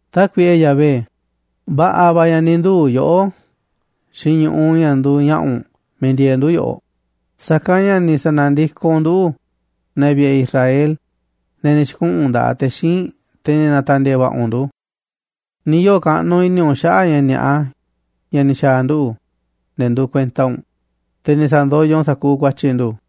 Tákuiꞌe Yahvé, va̱ꞌa̱ va̱ ña̱ ni̱ nduu̱ yoꞌó xiinꞌ ñu̱ꞌuꞌ ña̱ nduuꞌ ña̱ꞌa̱ u̱nꞌ miiꞌ ndieeꞌ ndu̱ yoꞌoꞌ, sa̱kanꞌ ña̱ ni̱ sa̱na̱ndikoꞌ u̱nꞌ nduꞌu̱ꞌ, ne̱ vi̱ꞌe̱ Israel, ne̱ ni̱ xi̱kuꞌu̱n nda̱ꞌaꞌ te̱ xíinꞌ, te̱ ni̱ na̱ta̱ndi̱e̱e̱ va̱ꞌa̱ u̱nꞌ ndu̱. Ni̱ yoo̱ kaꞌnuꞌ i̱ni̱ u̱nꞌ xaꞌa̱ꞌ ña̱ ni̱a̱ꞌa ña̱ ni̱ xa̱a̱ nduꞌu̱, ne̱ nduuꞌ kuenta u̱nꞌ, te̱ ni̱ sa̱ndoyoꞌ u̱nꞌ sa̱kuuꞌ ku̱a̱tyi̱ ndu̱.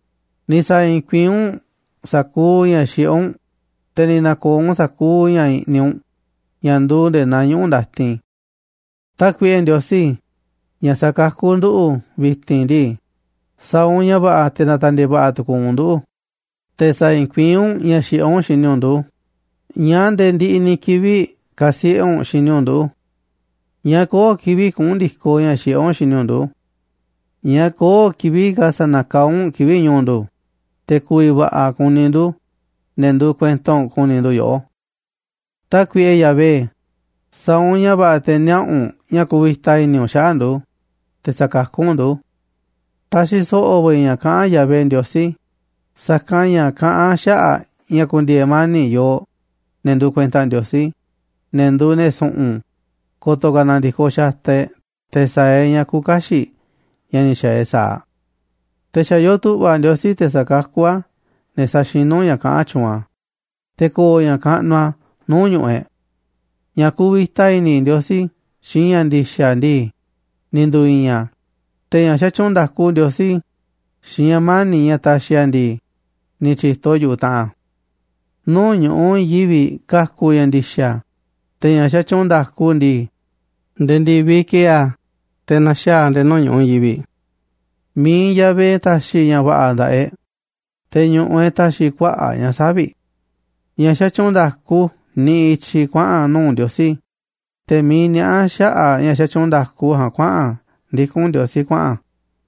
Ni̱ sa̱i̱i̱n kuiín u̱nꞌ sa̱kuuꞌ ña̱ xiꞌé u̱nꞌ, te̱ ni̱ na̱ko̱o̱ u̱nꞌ sa̱kuuꞌ ña̱ i̱ꞌniꞌ u̱nꞌ ña̱ nduuꞌ nde̱e̱ naa ñuꞌu̱ ndatin. Tákuiꞌe Ndiosí, ña̱ sa̱kakú nduꞌu̱ꞌ, vi̱ti̱n ndii, sa̱a̱ u̱nꞌ ña̱ va̱ꞌa̱ te̱ na̱ta̱ndi̱e̱e̱ va̱ꞌa̱ tu̱ku̱u̱ u̱nꞌ nduꞌu̱, te̱ sa̱i̱i̱n kuiín u̱nꞌ ña̱ xiꞌé u̱nꞌ xini u̱nꞌ ndu̱. ¿Ñáá nde̱e̱ ndiꞌiꞌ ni̱ kivi̱ꞌ ka̱siꞌe̱ u̱nꞌ xini u̱nꞌ nduꞌu̱ꞌ? ¿Ñáá köo̱ꞌ kivi̱ꞌ kuꞌu̱n ndi̱koꞌ ña̱ xiꞌé u̱nꞌ xini u̱nꞌ ndu̱? ¿Ñáá köo̱ꞌ kivi̱ꞌ ka̱ sa̱na̱kaá u̱nꞌ kivi̱ꞌ ñu̱u̱ ndu̱, te̱ ku̱vi̱ va̱ꞌa̱ kuni ndu̱, ne̱ nduuꞌ kuenta u̱nꞌ, ku̱ni̱ ndu̱ yoꞌó? Tákuiꞌe Yahvé, sa̱a̱ u̱nꞌ ña̱ va̱ꞌa̱ te̱ niaꞌa̱ u̱nꞌ ña̱ ku̱vi̱ta i̱ni̱ u̱nꞌ xaꞌa̱ꞌ ndu̱, te̱ sa̱kakú u̱nꞌ ndu̱. Taxiꞌ so̱ꞌo̱ va̱ i̱ ña̱ kaꞌán Yahvé Ndiosí, sa̱kanꞌ ña̱ kaꞌán a̱ xaꞌa̱ꞌ ña̱ ku̱ndi̱e̱e̱ mani̱ꞌ yooꞌ, ne̱ nduuꞌ kuenta Ndiosí, ne̱ nduuꞌ ne̱ su̱ꞌu̱n, ko̱to̱ ka̱ na̱ndi̱koꞌ xataꞌ e̱ꞌ te̱ sa̱a̱ e̱ꞌ ña̱ küuꞌ kaxiꞌ ña̱ ni̱ xa̱a̱ e̱ꞌ sa̱aꞌ. Te̱ xa̱ yoo tu̱ꞌva̱ Ndiosí te̱ sa̱kakú a̱ ne̱ saxinú ña̱ kaꞌán tyuunꞌ a̱, te̱ ko̱o̱ ña̱ kaꞌnuꞌ a̱ nuu̱ꞌ ñu̱ꞌuꞌ e̱ꞌ. Ña̱ kuvita i̱ni̱ Ndiosí xiinꞌ ña̱ ndi̱xa̱ ndii, ni̱ ndu̱i̱i̱n a̱, te̱ ña̱ xatyuunꞌ nda̱ku Ndiosí xiinꞌ ña̱ mani̱ꞌ ña̱ taxiꞌ a̱ ndii, ni̱ tyi̱to yu̱ꞌuꞌ taꞌanꞌ a̱. Nuu̱ꞌ ñu̱ꞌuꞌ i̱i̱n yivi̱ꞌ ka̱ku̱ ña̱ ndi̱xa̱, te̱ ña̱ xatyuunꞌ nda̱ku u̱nꞌ ndii, nde̱e̱ ndi̱viꞌ ki̱e̱e̱ a̱ te̱ na̱xaa̱ a̱ nde̱e̱ nuu̱ꞌ ñu̱ꞌuꞌ i̱i̱n yivi̱ꞌ. Mi̱iꞌ Yahvé ta̱xi̱ ña̱ va̱ꞌa̱ nda̱ꞌaꞌ e̱ꞌ, te̱ ñu̱ꞌuꞌ e̱ꞌ ta̱xi̱ kuaꞌa̱ꞌ ña̱ savi̱ꞌ. Ña̱ xatyuunꞌ nda̱ku niꞌiꞌ i̱tyiꞌ kuaꞌa̱n nuu̱ꞌ Ndiosí, te̱ miiꞌ niaꞌá xaꞌa̱ꞌ ña̱ xatyuunꞌ nda̱ku ja̱a̱nꞌ kuaꞌa̱n a̱ ndikún Ndiosí kuaꞌa̱n a̱.